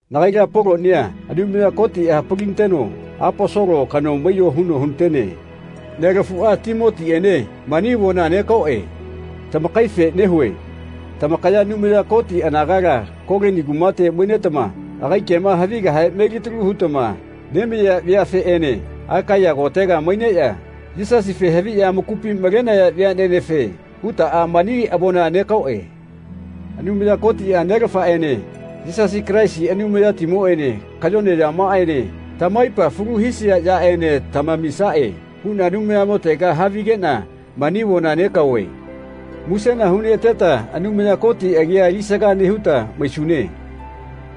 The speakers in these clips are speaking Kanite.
Nagaila Polonia Anumaya Kotiꞌa hapalinateno Aposolo kano maiyo huno hunatene. Nelafuꞌa Timotiꞌene mani avona negaoꞌe. Tamakaife nehuꞌe. Tamakaya Anumaya Koti anagala Kolini kumate mainetama agai kema havigahe melitalu hutama nemaiya veafeꞌene Akaiya kotega maineꞌya Yisasife haviꞌya amakupi malenaya veaꞌnenefe hutaꞌa mani avona negaoꞌe. Anumaya Kotiꞌa Nelafaꞌene Yisasi Kalaisi Anumayatimoꞌene kayone yamaꞌaene tamaipa falu hisia yaꞌene tamamisaꞌe huꞌna Anumayamotega havigeꞌna mani avona negaove. Musena huneꞌateta Anumaya Koti agia alisaga nehuta maisune.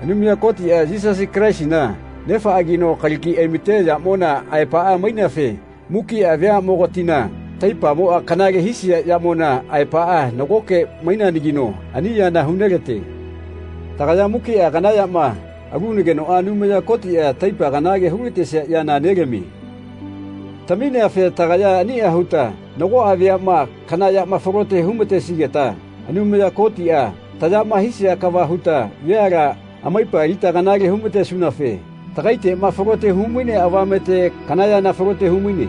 Anumaya Kotiꞌa Yisasi Kalaisina Nefaꞌagino kalagi aimate yamona aepaꞌa maineafe mukiꞌa veaꞌmogatina taipamoꞌa kanale hisia yamona aepaꞌa nagoke maineanagino ani yana hunelate. Tagaya mukiꞌa kana yama alunagenoꞌa Anumaya Kotiꞌa taipa kanale hulatesia yana nelamie. Tamineafe tagaya aniꞌa huta nagoꞌa veaꞌma kana yama falote humatesigeta Anumaya Kotiꞌa tayama hia kava huta veala amaipa alita kanale humatesunafe tagaiteꞌma falote humainea avamete kana yana falote humaine.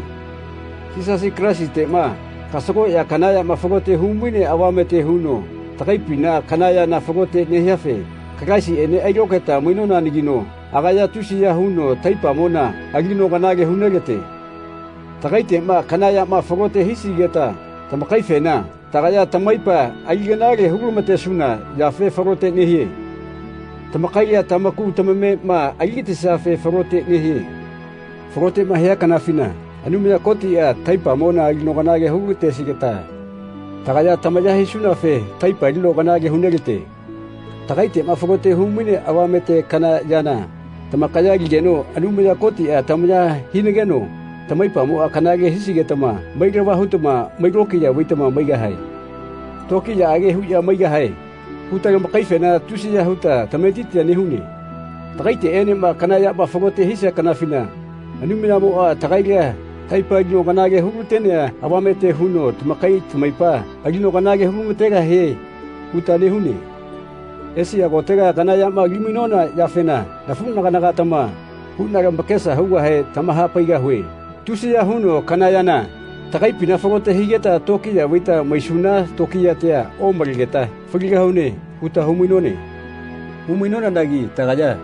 Yisasi Kalaisiteꞌma kasagoꞌya kana yama falote humainea avamete huno tagaipina kana yana falote nehiafe Kalaisiꞌene ailokaeta mainonanagino agaya tusiya huno taipamona alino kanale hunelate. Tagaiteꞌma kana yama falote hisigeta tamakaifena, tagaya tamaipa ali kanale hulamatesuna yafe falote nehie. Tamakaila tamaku tamamema aligatisiafe falote nehie. Faloteꞌma hia kanafina Anumaya Kotiꞌa taipamona alino kanale hulatesigeta tagaya tamaya hisunafe taipa alino kanale hunelate. Tagaiteꞌma falote humainea avamete kana yana tamakaya aligeno Anumaya Kotiꞌa tamaya hinageno tamaipamoꞌa kanale hisigetama mailava hutama mai lokiya vaitama maigahae. “Tokiyaꞌage huꞌya maigahae.” huta tamakaifena tusiya huta tametitia nehune. Tagaiteꞌenema kana yama folote hia kanafina Anumayamoꞌa tagaila taipa alino kanale hulatenea avamete huno tamakai tamaipa alino kanale hulamategahie huta nehune. Esia kotega kana yama alimainona yafena nafuꞌnaganatama huꞌna lamakesa hugahe tamahapaigahue. Tusiya huno kana yana tagaipina falote higeta tokiya vaita maisuna tokiyatia omalegeta “Faligahune.” huta humainone. Humainonanagi tagaya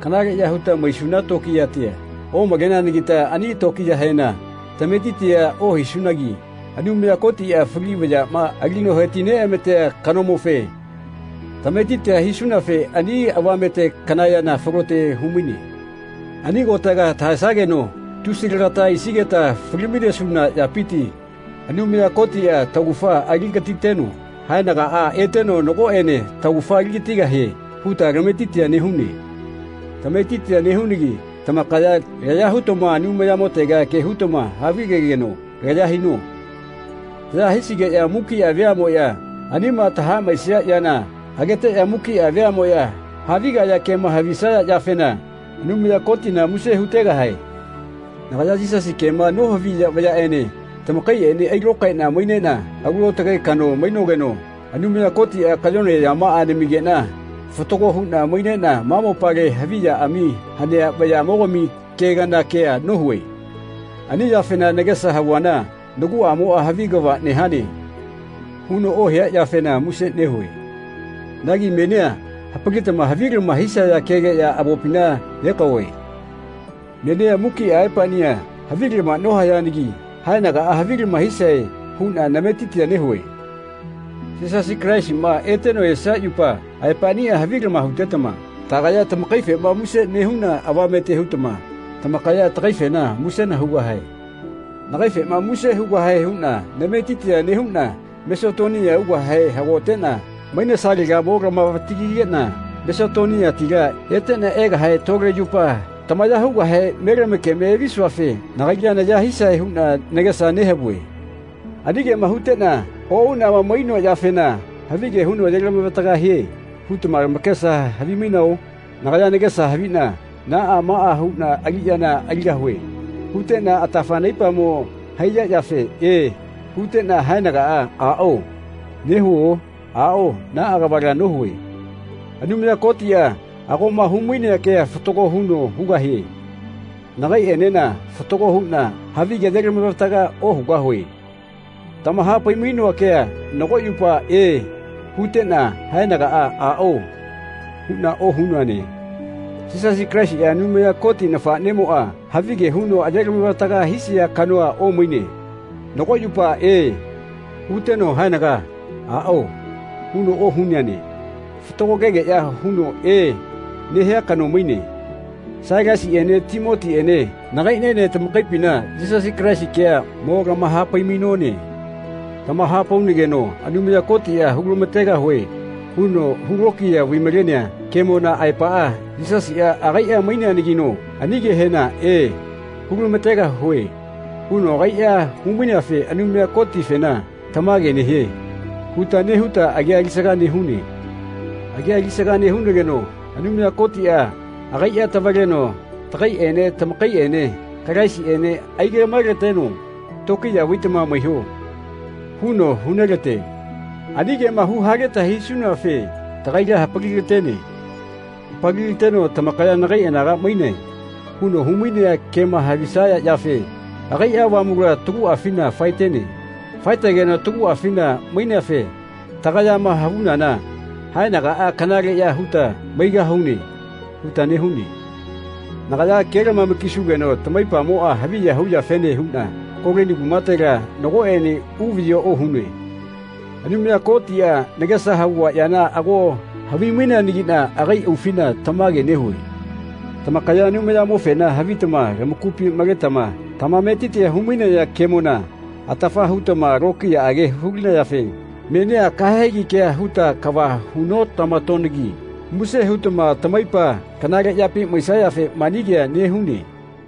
kanaleꞌya huta maisuna tokiyatia omaleneanagita ani lokiyahena tametitia ohisunagi Anumaya Kotiꞌa fali vayaꞌma alino heti-neꞌamatea kanomofe tametitia hisunafe ani avamete kana yana falote humaine. Ani kotega tahaesageno tusi lagata aisigeta fali-mainesuna yapiti Anumaya Kotiꞌa taugafa aligatiteno haenagaꞌa eteno nagoꞌene taugafa aligatigahie huta tametitia nehune. Tametitia nehunagi tamakaya laya hutama Anumayamotega ke hutama havigegeno laya hino. Taya hisigeꞌya mukiꞌa veaꞌmoꞌya anima tahaꞌmaesia yana ageteꞌya mukiꞌa veaꞌmoꞌya havigaya kema havisaya yafena Anumaya Kotina muse hutegahae. Nagaya Yisasi kema nohaviya veaꞌnene tamakaiꞌene ailokaeꞌna maineꞌna alu aotage kano mainogeno Anumaya Kotiꞌa kayone yamaꞌa namigeꞌna fatago huꞌna maineꞌna ma mopale haviꞌyaꞌami hanea vayaꞌmogami ke kana kea nohue. Ani yafena nagesa havuana naguꞌamoꞌa “Havi kava nehane.” huno ohia yafena muse nehue. Nagi menia hapalitama havilama hisaya kegeꞌya avopina negaove. Menia mukiꞌa aepaꞌnia havilama nohayanagi haenagaꞌa havilama hisae huꞌna nametitia nehue. Yisasi Kalaisiꞌma eteno esia yupa aepaꞌnia havilama hutetama tagaya tamakaifema muse nehuna avamete hutama tamakaya tagaifena musena hugahae. Nagaifena muse hugahae huꞌna nametitia nehuꞌna Masetonia ugahe hagoteꞌna mainesalega mo lamavatagigeꞌna Masetoniatila eteꞌna egahe tole yupa tamaya hugahe me lamakeme evisuafe nagaila naya hisae huꞌna nagesa nehavue. Ani kema huteꞌna oꞌuꞌnama mainoa yafena “Havige huno ayelavataga hie.” hutama tamakesa havimainao? Nagaya nagesa haviꞌna “Naꞌa maꞌa huꞌna aliꞌyana aligahue.” huteꞌna atafa naipamo haiya yafe “E.” huteꞌna haenaga “Aꞌao.” nehuo? Aꞌao naꞌa kavala nohue. Anumaya Kotiꞌa agoꞌma humainea kea fatago huno hugahie. Nagaiꞌenena fatago huꞌna havigea ayelamavataga ohugahue. Tamahapai-mainoa kea nago yupa “E.” huteꞌna haenaga “Aꞌao.” huꞌna ohunoane. Yisasi Kalaisiꞌa Anumaya Koti nafaꞌnemoꞌa havige huno ayelavataga hisia kanoa omaine. Nago yupa “E.” huteno haenaga “Aꞌao.” huno ohuneane. Fatago kegeꞌya huno “E.” nehia kano maine. Sailasiꞌene Timotiꞌene nagaiꞌniene tamakaipina Yisasi Kalaisi kea mo lamahapai-mainone. Tamahapaunageno Anumaya Kotiꞌa “Hulamategahue.” huno hulokiya vai-malenea kemona aepaꞌa Yisasiꞌa agaiꞌa maineanagino ani kehena “E, hulamategahue.” huno agaiꞌa humaineafe Anumaya Kotifena “Tamage nehie.” huta nehuta agia alisaga nehune. Agia alisaga nehunageno Anumaya Kotiꞌa agaiꞌa tavaleno tagaiꞌene tamakaiꞌene Kalaisiꞌene aigaꞌmaelateno “Tokiya vaitama maiho.” huno hunelate. Ani kema huhaleta hisunafe tagaila hapalilatene. Hapalilateno “Tamakaya nagai anaga mainae.” huno humainea kema havisaya yafe agaiꞌa Avamula taguꞌafina faetene. Faetegeno taguꞌafina maineafe tagayama havunana “Haenagaꞌa kanaleꞌya huta maigahune.” huta nehune. Nagaya kelamama-kisugeno tamaipamoꞌa haviya huyafene huꞌna Kolini kumatela nagoꞌene uvaꞌyi ohunoe. Anumaya Kotiꞌa nagesa havua yana ago havimaineanagiꞌna agai aufina tamage nehue. Tamakaya Anumayamofena havitama lamakupi maletama tamametiti humainaya kemona atafa hutama tokiyaꞌage hulinayafe menia kahegi kea huta kava hu notamatonagi muse hutama tamaipa kanale yapi maisayafe mani kea nehune.